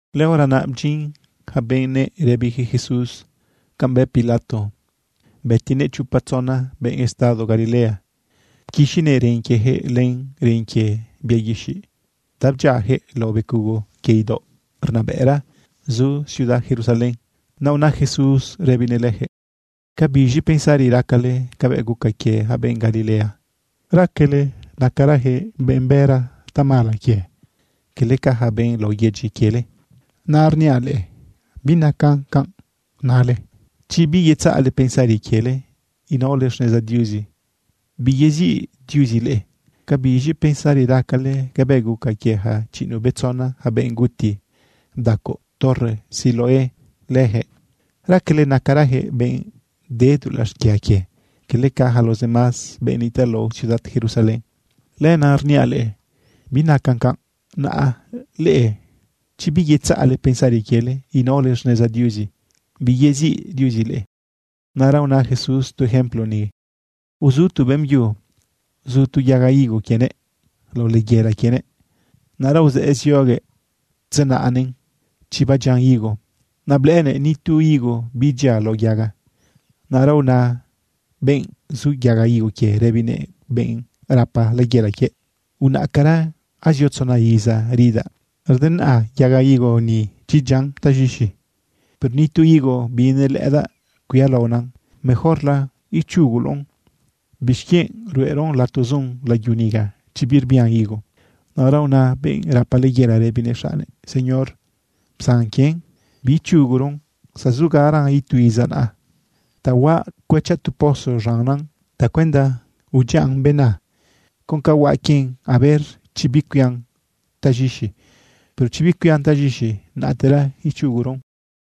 Lëhora naꞌ bdyin yaca benëꞌ rëbiyaquëꞌ Jesús canꞌ bë Pilato bëtinëꞌ chopa tzona benꞌ estado Galilea. Pquixinëꞌ ren quieyaquëꞌ len ren quie bia guixiꞌ ta bdyiayaquëꞌ lao becugo quie idaoꞌ rnabëꞌra zu ciudad Jerusalén. Naꞌ una Jesús rëbinëꞌ leyaquëꞌ: ―¿Ca biz̃i pensari racale cabëꞌ guca quie yaca benꞌ Galilea? ¿Raquele nacarayaquëꞌ benꞌ bëra tamala quie, cala ca yaca benꞌ lao yedyi quiele? Naꞌra rniaꞌ leꞌe, binacan canꞌ. Naꞌ leꞌe, chi biyetzaꞌle pensari quiele inaole xneza Diuzi, biyeziꞌ Diuzi leꞌe. ¿Ca biz̃i pensari racale cabëꞌ guca quie yaca chiꞌinuꞌbetzona yaca benꞌ guti bdacoꞌ torre Siloé leyaquëꞌ? ¿Raquele nacarayaquëꞌ benꞌ de dulaꞌ xquia quie, cala ca yaca los demás benꞌ nitaꞌ lao ciudad Jerusalén? Lenaꞌ rniaꞌ leꞌe, binacan canꞌ. Naꞌ leꞌe chi biyetzaꞌle pensari quiele inaole xneza Diuzi, biyeziꞌ Diuzi leꞌe. Naꞌra una Jesús tu ejemplo ni: ―Uzu tu beꞌmbyu zu tu yaga higo quienëꞌ lao layela quienëꞌ. Naꞌra uzëꞌë zioguëꞌ tzenaꞌnëꞌn chi badyian higo, naꞌ blëꞌënëꞌ ni tu higo bidyia lao yaga. Naꞌra una benꞌ zu yaga higo quie, rëbinëꞌ benꞌ rapa layela quiëꞌ: “Unaꞌcara, azio tzona iza ridaꞌ denaꞌa yaga higo ni chi dyian taz̃ixi, pero ni tu higo binelëꞌëdaꞌ cuialaonan. Mejorla ichuguloꞌn, ¿bixquienꞌ ruꞌeron lato zun layu niga, chi birbian higo?” Naꞌra una benꞌ rapa layela rëbinëꞌ xaꞌnnëꞌ: “Señor, psan quien, biichuguron zazugaran itu iza naꞌa. Ta huaꞌ cuëchaꞌ tu pozo z̃annan tacuenda udyiaꞌn bena. Con ca huaꞌ quien, a ver chi bicuian taz̃ixi. Pero chi bicuian taz̃ixi, naꞌtera ichuguron.”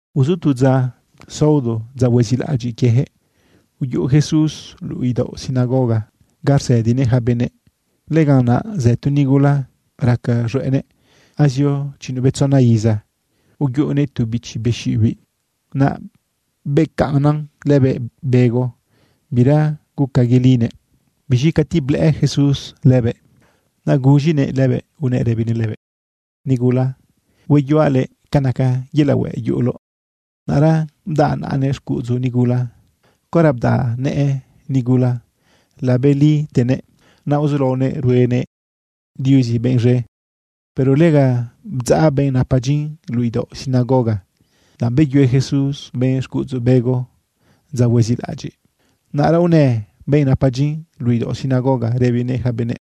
Uzu tu dza saodo, dza huezilaꞌadyiꞌ quieyaquëꞌ, uyuꞌu Jesús luꞌu idaoꞌ sinagoga ga rsëdinëꞌ yaca benëꞌ. Lëganꞌ naꞌ zë tu nigula raca z̃hueꞌnëꞌ. Azio chiꞌinuꞌbetzona iza uyuꞌunëꞌ tu bichi be xiꞌibiꞌ, naꞌ becaꞌnnan lëbëꞌ bego, bira guca yelinëꞌ. Biz̃i cati blëꞌë Jesús lëbëꞌ, naꞌ guz̃inëꞌ lëbëꞌ unëꞌ rëbinëꞌ lëbëꞌ: ―Nigula, hueyuaꞌ luëꞌ ca naca yelaꞌ hueꞌ yuꞌuloꞌ. Naꞌra bdaꞌ naꞌanëꞌ xcuꞌudzu nigula. Caora bdaꞌnëꞌ nëꞌë nigula, labelitenëꞌ. Naꞌ uzulaonëꞌ ruenëꞌ Diuzi benꞌ z̃e. Pero lega bdzaꞌ benꞌ napa dyin luꞌu idaoꞌ sinagoga, danꞌ beyue Jesús benꞌ xcuꞌudzu bego dza huezilaꞌadyiꞌ. Naꞌra unë benꞌ napa dyin luꞌu idaoꞌ sinagoga rëbinëꞌ yaca benëꞌ: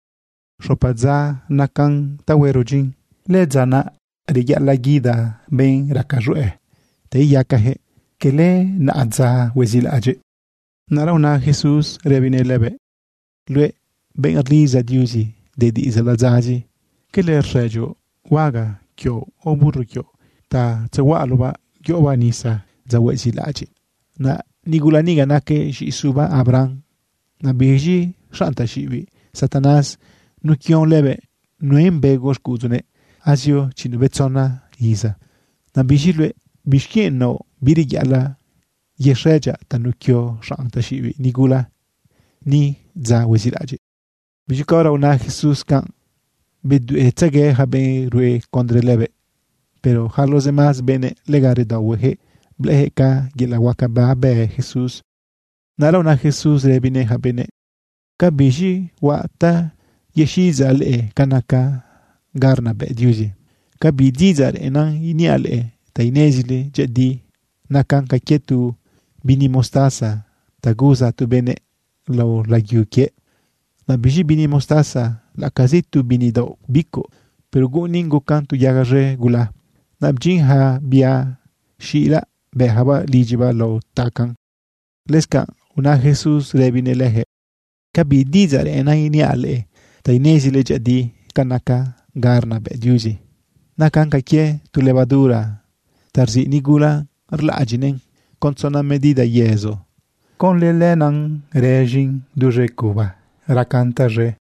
―Xopa dza nacan ta huero dyin. Lëdza naꞌ reyaꞌalaꞌ guida benꞌ raca z̃hueꞌ ta iyacayaquëꞌ, cala naꞌadza huezilaꞌadyiꞌ. Naꞌra una Jesús rëbinëꞌ lëbëꞌ: ―Luëꞌ benꞌ rlidza Diuzi de diꞌidzaꞌ ladzazi, ¿cala rxëdyoꞌ huaga quioꞌ o burro quioꞌ ta tzehuaꞌaloꞌbaꞌ yoꞌobaꞌ nisa dza huezilaꞌadyiꞌ? Naꞌ nigula niga naquëꞌ z̃iꞌi suba Abraham. Naꞌ biz̃i xanꞌ taxiꞌibiꞌ Satanás nuquion lëbëꞌ nuen bego xcuꞌudzunëꞌ azio chiꞌinuꞌbetzona iza. Naꞌ biz̃i luëꞌ, ¿bixquienꞌ naoꞌ bireyaꞌalaꞌ yexëdyaꞌ tanuquio xanꞌ taxiꞌibiꞌ nigula ni dza huezilaꞌadyiꞌ? Biz̃i caora una Jesús canꞌ, bedueꞌtzegue yaca benꞌ rue condre lëbëꞌ. Pero yaca los demás benëꞌ, lega redaohueyaquëꞌ blëꞌëyaquëꞌ ca yelaꞌ huaca babë Jesús. Naꞌra una Jesús rëbinëꞌ yaca benëꞌ: ―¿Ca biz̃i huaꞌ ta yexiꞌidzaꞌ leꞌe ca naca ga rnabëꞌ Diuzi? ¿Ca bi diꞌidzaꞌ reꞌennan iniaꞌ leꞌe ta inezile dyëꞌëdi? Nacan ca quie tu bini mostaza ta guza tu benëꞌ lao layu quiëꞌ. Naꞌ biz̃i bini mostaza, laꞌacazi tu bini daoꞌ bicuꞌ, pero guꞌunin gucan tu yaga z̃e gula. Naꞌ bdyin yaca bia xila bëyacabaꞌ lidyibaꞌ lao tacaꞌn. Lëscanꞌ una Jesús rëbinëꞌ leyaquëꞌ: ―¿Ca bi diꞌidzaꞌ reꞌennan iniaꞌ leꞌe ta inezile dyëꞌëdi ca naca ga arnabëꞌ Diuzi? Nacan ca quie tu levadura ta rziꞌ nigula rlaꞌadyiꞌnëꞌn con tzona medida yezo. Conlë lenaꞌ rëz̃in duz̃e cuba racan taz̃e.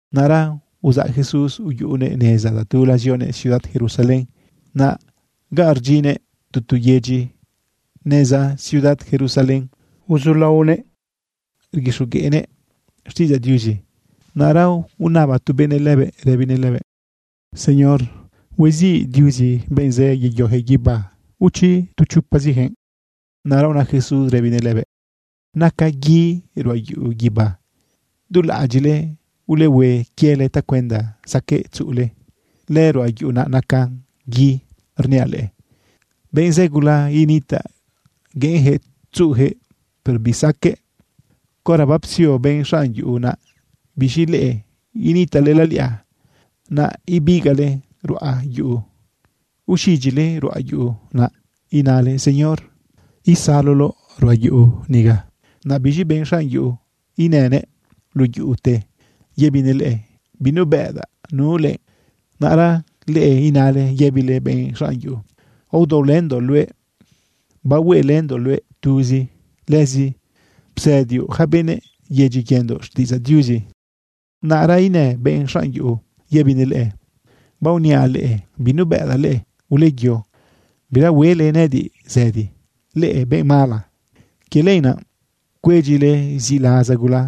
Naꞌra uzaꞌ Jesús uyuꞌunëꞌ neza tatula zionëꞌ ciudad Jerusalén. Naꞌ ga rdyinnëꞌ tu tu yedyi neza ciudad Jerusalén uzulaonëꞌ rguixogueꞌnëꞌ xtiꞌidzaꞌ Diuzi. Naꞌra unaba tu benëꞌ lëbëꞌ rëbinëꞌ lëbëꞌ: ―Señor, ¿hueziꞌ Diuzi benꞌ zë yeyoyaquëꞌ guibá o chi tu chopaziyaquëꞌ? Naꞌra una Jesús rëbinëꞌ lëbëꞌ: ―Naca gui ruꞌa yuꞌu guibá. Dulaꞌadyiꞌle ulehue quiele tacuenda saqueꞌ tzuꞌule lëruꞌa yuꞌu naca gui. Rniaꞌ leꞌe, benꞌ zë gula initaꞌ gueꞌenyaquëꞌ tzuꞌuyaquëꞌ, pero bisaqueꞌ. Caora bapsio benꞌ xanꞌ yuꞌu naꞌ, biz̃i leꞌe initaꞌle laliꞌa, naꞌ ibigaꞌle ruꞌa yuꞌu, uxidyile ruꞌa yuꞌu, naꞌ inale: “Señor, isaloloꞌ ruꞌa yuꞌu niga.” Naꞌ biz̃i benꞌ xanꞌ yuꞌu inënëꞌ luꞌu yuꞌute yëbinëꞌ leꞌe: “Binubëꞌdaꞌ nu leꞌe.” Naꞌra leꞌe inale yëbile benꞌ xanꞌ yuꞌu: “Aodaolëndoꞌ luëꞌ, bahueꞌelëndoꞌ luëꞌ tuzi. Lëzi psëdioꞌ yaca benëꞌ yedyi quiendoꞌ xtiꞌidzaꞌ Diuzi.” Naꞌra inë benꞌ xanꞌ yuꞌu yëbinëꞌ leꞌe: “Baoniaꞌ leꞌe, binubëꞌdaꞌ leꞌe. Uleyo bira huele nëꞌëdiꞌ zëdi, leꞌe benꞌ mala.” Quie lenaꞌ cuedyile ziꞌlaza gula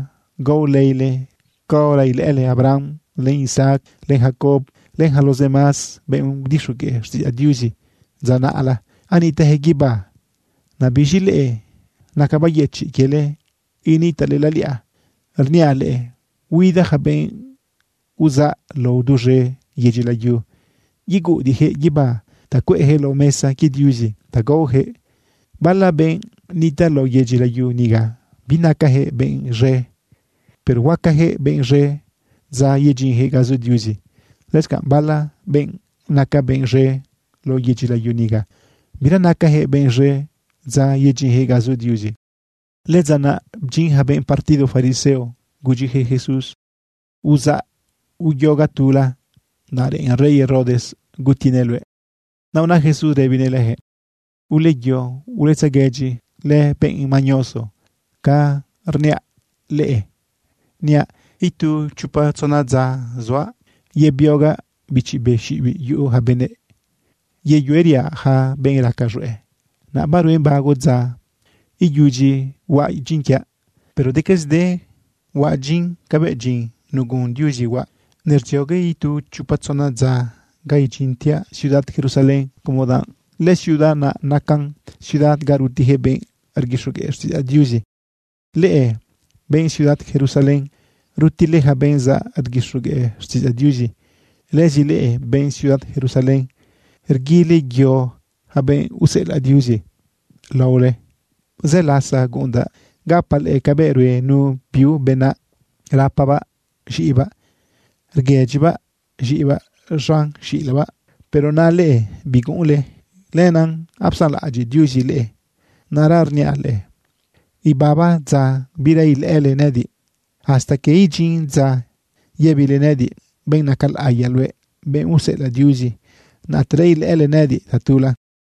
gao leile caora ilëꞌële Abraham, len Isaac, len Jacob, len yaca los demás benꞌ udixogueꞌ xtiꞌidzaꞌ Diuzi dza naꞌla anitaꞌyaquëꞌ guibá, naꞌ biz̃i leꞌe, naca bayëchiꞌ quiele initaꞌle laliꞌa. Rniaꞌ leꞌe, huida yaca benꞌ uzaꞌ lao duz̃e yedyi layu yeguꞌudiꞌyaquëꞌ guibá ta cueꞌyaquëꞌ lao mesa quie Diuzi ta gaoyaquëꞌ. Bala benꞌ nitaꞌ lao yedyi layu niga, binacajëꞌ benꞌ z̃e, pero huacajëꞌ benꞌ z̃e dza yedyinjëꞌ ga zu Diuzi. Lëscanꞌ bala benꞌ naca benꞌ z̃e lao yedyi layu niga, bira nacajëꞌ benꞌ z̃e dza yedyinjëꞌ ga zu Diuzi. Lëdza naꞌ bdyin yaca benꞌ partido fariseo gudyiyaquëꞌ Jesús: ―Uzaꞌ uyo ga tula, danꞌ reꞌen rey Herodes gutinëꞌ luëꞌ. Naꞌ una Jesús rëbinëꞌ leyaquëꞌ: ―Uleyo uletzeguëdyi lëbenꞌ mañoso ca rniaꞌ leꞌe, niaꞌ: “Itu chopa tzona dza suaꞌ yebiogaꞌ bichi be xiꞌibiꞌ yuꞌu yaca benëꞌ, yeyueriaꞌ yaca benꞌ raca z̃hueꞌ. Naꞌ baruen bago dza iyudyi huaꞌ dyin quiaꞌ.” Pero decazide huaꞌ dyin cabëꞌ dyin nagun Diuzi huaꞌ. Nerdziogue itu chopa tzona dza ga idyintiaꞌ ciudad Jerusalén como danꞌ lëciudad naꞌ nacan ciudad ga rutiyaquëꞌ benꞌ rguixogueꞌ xtiꞌidzaꞌ Diuzi. ’Leꞌe benꞌ ciudad Jerusalén, rutile yaca benꞌ zaꞌ rguixogueꞌ xtiꞌidzaꞌ Diuzi. Lëzi leꞌe benꞌ ciudad Jerusalén, rguile yo yaca benꞌ useꞌelaꞌ Diuzi laole. Zë lasa guꞌundaꞌ gapaꞌ leꞌe cabëꞌ rue nu biu benaꞌ, rapabaꞌ z̃iꞌibaꞌ, rguëdyibaꞌ z̃iꞌibaꞌ z̃an xilabaꞌ. Pero naꞌ leꞌe, biguꞌunle. Lenaꞌ apsanlaꞌadyiꞌ Diuzi leꞌe. Naꞌra rniaꞌ leꞌe, ibaba dza bira ilëꞌële nëꞌëdiꞌ. Hasta quie idyin dza yëbile nëꞌëdiꞌ: “Benꞌ naca laꞌiya luëꞌ, benꞌ useꞌelaꞌ Diuzi, naꞌtera ilëꞌële nëꞌëdiꞌ tatula.”